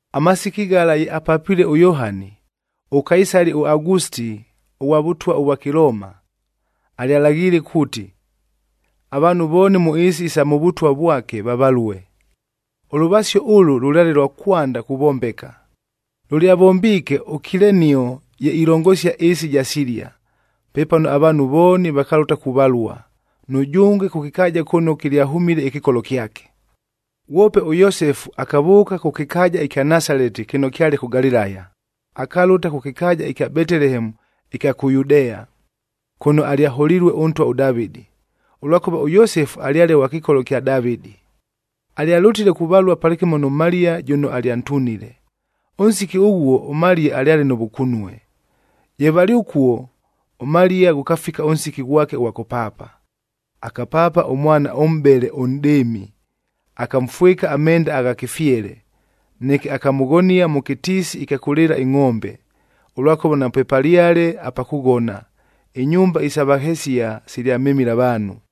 Amasiki ghala ye apapilue ʉYohani, ʉKaisali ʉAgusitia ʉghwa vʉtwa ʉvwa Kɨlooma,b alyalaghiile kuuti, avaanhu vooni mʉ ɨɨsi isa mʉ vʉtwa vwake, vavalue. Ʉlʉvasio ʉlʉ lʉlyale lwa kwanda kuvombeka. Lʉlyavombiike ʉKilenio ye ilongosia ɨɨsi ɨja Silia. Pepano avaanhu vooni vakalʉta kuvalua, nʉjʉnge kʉ kɨkaaja kʉno kɨlyahʉmile ɨkɨkolo kyake. Ghwope ʉYosefu akavʉʉka kʉ kɨkaaja ɨkya Nasaleti kɨno kyale kʉ Galilaya, akalʉta kʉ kɨkaaja ɨkya Betelehemu ɨkya kʉ Yudea, kʉno alyaholilue ʉntwa ʉDavɨdi, ʉlwakʉva ʉYosefu alyale ghwa kɨkolo kya Davɨdi. Alyalʉtile kuvalua palɨkɨmo nʉ Maliya jʉno alyantunile. Ʉnsiki ʉghuo ʉMaliya alyale nʉ vʉkunue. Ye valɨ ʉkuo, ʉMaliya ghʉkafika ʉnsiki ghwake ʉghwa kʉpaapa. Akapaapa ʉmwana ʉmʼbele ʉnʼdɨɨmi, akamfwɨka amenda gha kɨfyele. Neke akamʉghonia mʉ kɨtiisi ɨkya kʉlɨɨla ingʼombe, ʉlwakʉva napwepalyale apa kʉghona, inyumba isa vahesia silyamemile avaanhu.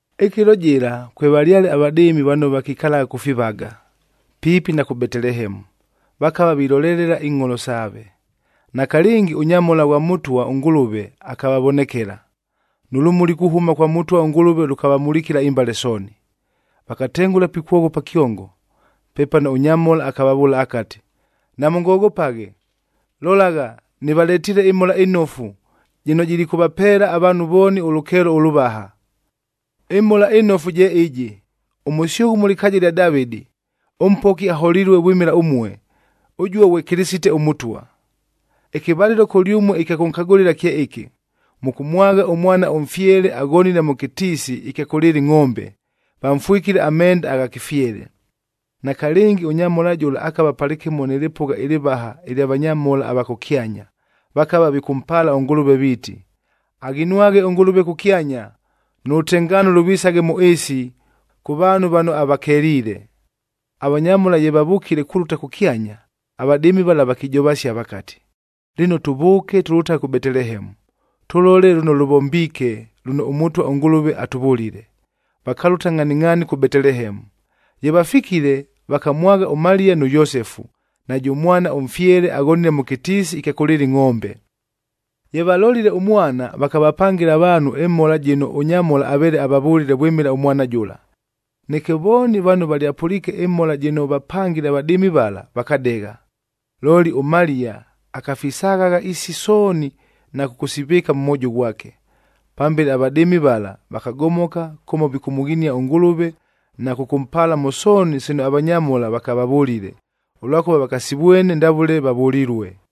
Ɨkɨlo jɨla kwevalyale avadɨɨmi vano vakikalagha kʉ fivaga, piipi na kʉ Betelehemu, vakava vilolelela ingʼholo saave. Nakalɨngi ʉnyamhola ghwa Mʉtwa ʉNgʉlʉve akavavonekela, nʉ lʉmuli kuhʉma kwa Mʉtwa ʉNgʉlʉve lʉkavamulikila imbale sooni. Vakatengʉla pikwoghopa kyongo. Pepano ʉnyamhola akavavʉʉla akati, “Namʉngoghopaghe! Lolagha, nɨvaletiile ɨMhola ɨNofu, jɨno jilikʉvapeela avaanhu vooni ʉlʉkeelo ʉlʉvaha. Ɨmhola ɨnofu je ɨjɨ, ʉmʉsyʉghʉ mʉ lɨkaaja lya Davɨdi, ʉMpoki aholilue vwɨmɨla ʉmue, ʉjuo ghwe Kɨlɨsitec ʉMʉtwa. Ɨkɨvalɨlo kʉlyʉmue ɨkya kʉnkagʉlɨla kye ɨkɨ: Mʉkʉmwagha ʉmwana ʉmfyele, aghonile mʉ kɨtiisi ɨkya kʉlɨɨla ingʼombe, vamfwɨkile amenda agha kɨfyele.” Nakalɨngi ʉnyamhola jʉla akava palɨkɨmo nɨ lɨpʉgha ɨlɨvaha ɨlya vanyamhola ava kʉkyanya, vakava vikʉmpaala ʉNgʉlʉve viiti, “Aghinwaghe ʉNgʉlʉve kʉkyanya, nʉ lʉtengaano lʉvisaghe mʉ ɨɨsi, kʉ vaanhu vano avakeliile.” Avanyamhola ye vavʉkile kulʉta kʉkyanya, avadɨɨmi vala vakijovasia vakati, “Lɨno, tʉvʉʉke tʉlʉtaghe kʉ Betelehemu, tʉlole lʉno lʉvombiike lʉno ʉMʉtwa ʉNgʉlʉve atʉvʉlile.” Vakalʉta ngʼhaningʼhaani kʉ Betelehemu. Ye vafikile, vakamwagha ʉMaliya nʉ Yosefu, najʉ mwana ʉmfyele aghonile mʉ kɨtiisi ɨkya kʉlɨɨla ingʼombe. Ye vamʉlolile ʉmwana, vakavapangɨla avaanhu ɨmhola jɨno ʉnyamhola aveele avavʉlile vwɨmɨla ʉmwana jʉla. Neke vooni vano valyapʉliike ɨmhola jɨno vapangile avadɨɨmi vala, vakadegha. Looli, ʉMaliya akafisaghagha isi sooni na kʉkʉsivɨɨka mʉ mwojo ghwake. Pambele avadɨɨmi vala, vakagomoka kʉmo vikʉmʉghinia ʉNgʉlʉve, na kʉkʉmpaala mʉ sooni sino avanyamhola vakavavʉlile, ʉlwakʉva vakasivwene ndavʉle vavʉlilue.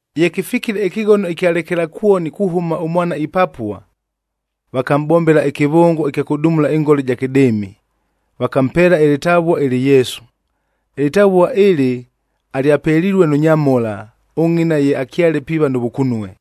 Ye kɨfikile ɨkɨghono ɨkya lekelakwoni kuhʉma ʉmwana ipapua, vakamʼbombela ɨkɨvʉngo ɨkya kʉdumula ɨngola ɨja kɨdɨɨmi, vakampeela ɨlɨtavua ɨlɨ Yesu. Ɨlɨtavua ɨlɨ alyapelilue nʉ nyamhola, ʉngʼina ye akyale piiva nʉ vʉkunue.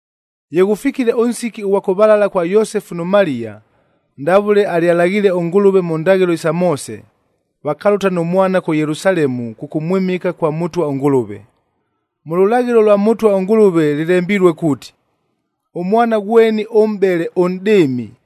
Ye ghʉfikile ʉnsiki ʉghwa kʉvalalad kwa Yosefu nʉ Maliya, ndavʉle alyalaghiile ʉNgʉlʉve mʉ ndaghɨlo isa Moose, vakalʉta nʉ mwana kʉ Yelusalemu kʉkʉmwɨmɨka kwa Mʉtwa ʉNgʉlʉve. Mʉ lʉlaghɨlo lwa Mʉtwa ʉNgʉlʉve lɨlembilue kuuti, “Ʉmwana ghweni ʉmʼbele ʉnʼdɨɨmi,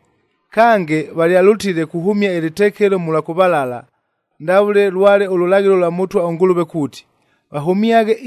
Kange, valyalʉtile kuhʉmia ɨlɨtekelo mʉlwa kʉvalala, ndavʉle lwale ʉlʉlaghɨlo lwa Mʉtwa ʉNgʉlʉve kuuti, vahʉmyaghe,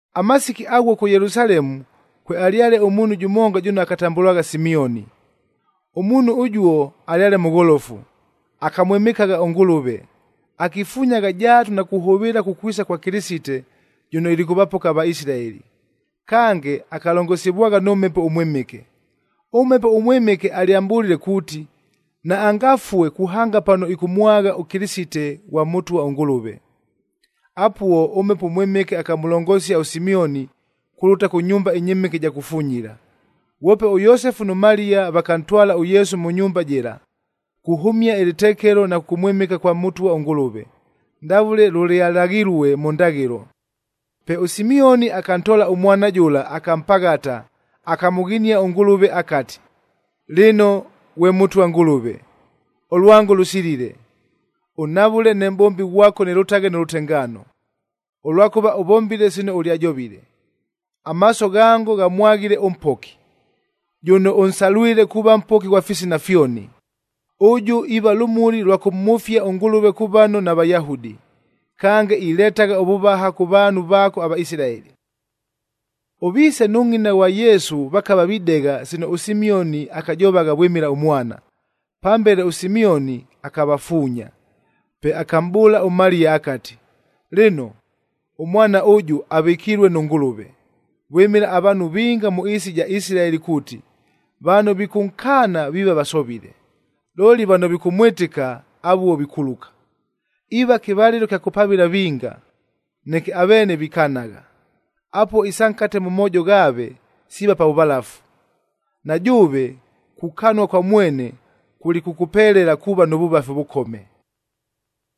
Amasiki aghuo kʉ Yelusalemu, kwealyale ʉmuunhu jʉmonga jʉno akatambʉlwagha Simioni. Ʉmuunhu ʉjuo alyale mʉgholofu, akamwɨmɨkagha ʉNgʉlʉve, akifunyagha jaatu na kuhʉvɨɨla kukwisa kwa Kɨlɨsite, jʉno ilikʉvapoka aVaisilaeli. Kange, akalongosivwagha nʉ Mhepo ʉMwɨmɨke. ɄMhepo ʉMwɨmɨke alyamʼbʉlile kuuti, naangafue kuhanga pano ɨkʉmwagha ʉKɨlɨsite ghwa Mʉtwa ʉNgʉlʉve. Apuo, ʉMhepo ʉMwɨmɨke akamʉlongosia ʉSimioni kulʉta kʉ nyumba ɨnyɨmɨke ɨja kufunyila. Ghwope ʉYosefu nʉ Maliya vakantwala ʉYesu mʉ nyumba jɨla, kuhʉmia ɨlɨtekelo na kʉkʉmwɨmɨka kwa Mʉtwa ʉNgʉlʉve, ndavʉle lʉlyalaghilue mʉ ndaghɨlo. Pe ʉSimioni akantoola ʉmwana jʉla akampaghata, akamʉghinia ʉNgʉlʉve akati, “Lɨno, ghwe Mʉtwa Ngʉlʉve, ʉlwango lʉsilile, ʉnhavʉle ne mʼbombi ghwako nɨlʉtaghe nʉ lʉtengaano, ʉlwakʉva ʉvombile sino ʉlyajovile. Amaaso ghango ghamwaghile ʉMpoki, jʉno ʉnsalwile kuuva Mpoki ghwa fisina fyoni. Ʉjʉ iiva lʉmuli lwa kʉmhʉfia ʉNgʉlʉve kʉ vano naVayahudi, kange iletagha ʉvʉvaha kʉ vaanhu vaako aVaisilaeli.” Ʉviise nʉ ngʼina ghwa Yesu vakava videgha sino ʉSimioni akajovagha vwɨmɨla ʉmwana. Pambele ʉSimioni akavafuunya. Pe akamʼbʉʉla ʉMaliya akati, “Lɨno, ʉmwana ʉjʉ avɨkilue nʉ Ngʉlʉve, vwɨmɨla avaanhu vinga mʉ ɨɨsi ɨja Isilaeli kuuti, vano vikʉnkaana viiva vasovile, looli vano vikʉmwɨtɨka avuo vikuluka. Iiva kɨvalɨlo kya kʉpavɨla vinga, neke aveene vikanagha, apuo isa nkate mʉ moojo ghaave siiva pa vʉvalafu. Na jʉʉve, kukanua kwa mwene kulikʉkʉpelela kuuva nʉ vʉvafi ʉvʉkome.”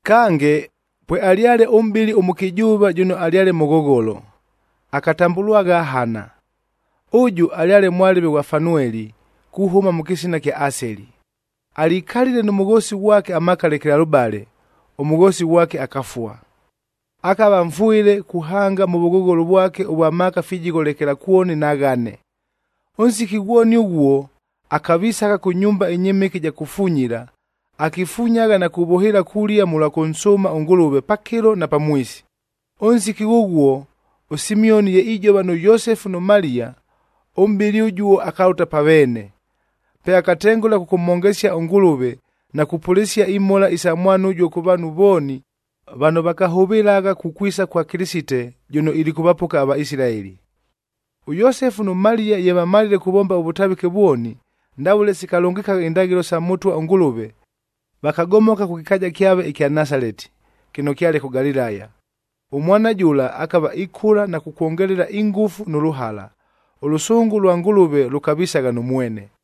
Kange, pwealyale ʉmʼbɨli ʉmʉkɨjʉʉva jʉno alyale mʉghogholo, akatambʉlwagha Hana. Ʉjʉ alyale mwalɨve ghwa Fanueli kuhʉma mʉ kɨsina kya Aseli. Alikalile nʉ mʉghoosi ghwake amaaka lekelalʉbale, ʉmʉghoosi ghwake akafua. Akava mfwɨle kuhanga mʉ vʉghogholo vwake ʉvwa maaka fijigho lekelakwoni na ghane. Ʉnsiki ghwoni ʉghuo, akavisagha kʉ nyumba ɨnyɨmɨke ɨja kufunyila, akifunyagha na kuvʉhɨɨla kulia mʉlwa kʉnsʉʉma ʉNgʉlʉve pakɨlo na pamwisi. Ʉnsiki ghʉghuo ʉSimioni ye ijova nʉ Yosefu nʉ Maliya, ʉmʼbɨli ʉjuo akalʉta pa veene. Pe akatengʉla kʉkʉmhongesia ʉNgʉlʉve, na kupʉlɨsia imhola isa mwana ʉjuo kʉ vaanhu vooni, vano vakahʉvɨlagha kukwisa kwa Kɨlɨsite, jʉno ilikʉvapoka aVaisilaeli. ɄYosefu nʉ Maliya ye vamalile kuvomba ʉvʉtavɨke vwoni, ndavʉle sikalʉngɨkagha indaghɨlo sa Mʉtwa ʉNgʉlʉve, vakagomoka kʉ kɨkaaja kyave ɨkya Nasaleti, kɨno kyale kʉ Galilaya. Ʉmwana jʉla akava ikʉla na kukwongelela ingʉfu nʉ lʉhala, ʉlʉsʉngʉ lwa Ngʉlʉve lʉkavisagha nʉ mwene.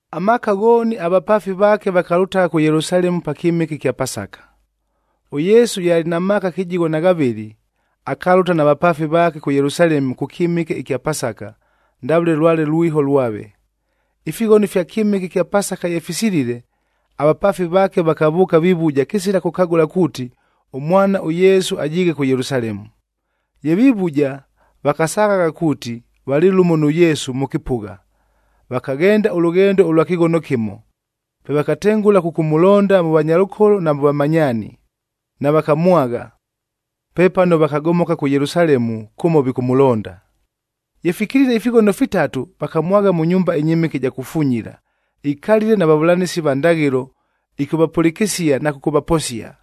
Amaaka ghooni avapaafi vaake vakalʉtagha kʉ Yelusalemu pa kyɨmɨke ɨkya Pasaka.g ɄYesu ye alɨ na maaka kɨjigho na ghavɨlɨ, akalʉta na vapaafi vaake kʉ Yelusalemu kʉ kyɨmɨke ɨkya Pasaka, ndavʉle lwale lwiho lwave. Ifighono fya kyɨmɨke ɨkya Pasaka ye fisilile, avapaafi vaake vakavʉʉka vivuja kɨsila kʉkagʉla kuuti, ʉmwana ʉYesu ajiighe kʉ Yelusalemu. Ye vivuja, vakasaghagha kuuti, valɨ lʉmo nʉ Yesu mʉ kɨpʉgha, vakaghenda ʉlʉghendo ʉlwa kɨghono kɨmo. Pe vakatengʉla kʉkʉmʉlonda mʉ vanyalʉkolo na mʉ vamanyaani, navakamwagha. Pepano vakagomoka kʉ Yelusalemu kʉmo vikʉmʉlonda. Ye fikilile ifighono fitatu, vakamwagha mʉ nyumba ɨnyɨmɨke ɨja kufunyila, ikalile na vavʉlanɨsi va ndaghɨlo, ɨkʉvapʉlɨkɨsia na kʉkʉvaposia.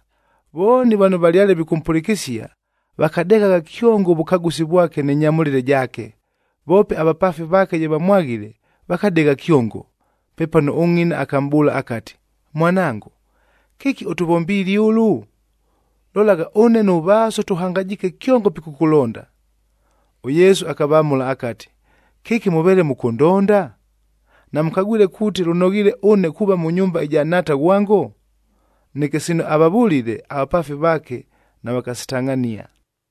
Vooni vano valyale vikʉmpʉlɨkɨsia, vakadeghagha kyongo ʉvʉkagʉsi vwake nɨ nyamʉlɨle jaake. Voope avapaafi vaake ye vamwaghile, vakadegha kyongo. Pepano ʉngʼina akamʼbʉʉla akati, “Mwanango, kɨki ʉtʉvombiile ʉlʉ? Lolagha, ʉne nʉ vaaso tʉhangajiike kyongo pikʉkʉlonda.” ɄYesu akavamʉla akati, “Kɨki mʉveele mʉkʉndonda? Namʉkagwile kuuti lʉnoghiile ʉne kuuva mʉ nyumba ɨja Nhaata ghwango?” Neke sino avavʉlile, avapaafi vaake navakasitangʼhania.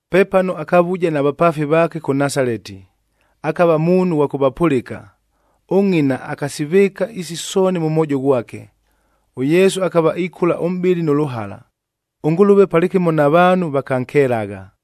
Pepano akavuja na vapaafi vaake kʉ Nasaleti, akava muunhu ghwa kʉvapʉlɨka. Ʉngʼina akasivɨɨka isi sooni mʉ mwojo ghwake. ɄYesu akava ikʉla ʉmʼbɨlɨ nʉ lʉhala, ʉNgʉlʉve palɨkɨmo na vaanhu vakankelagha.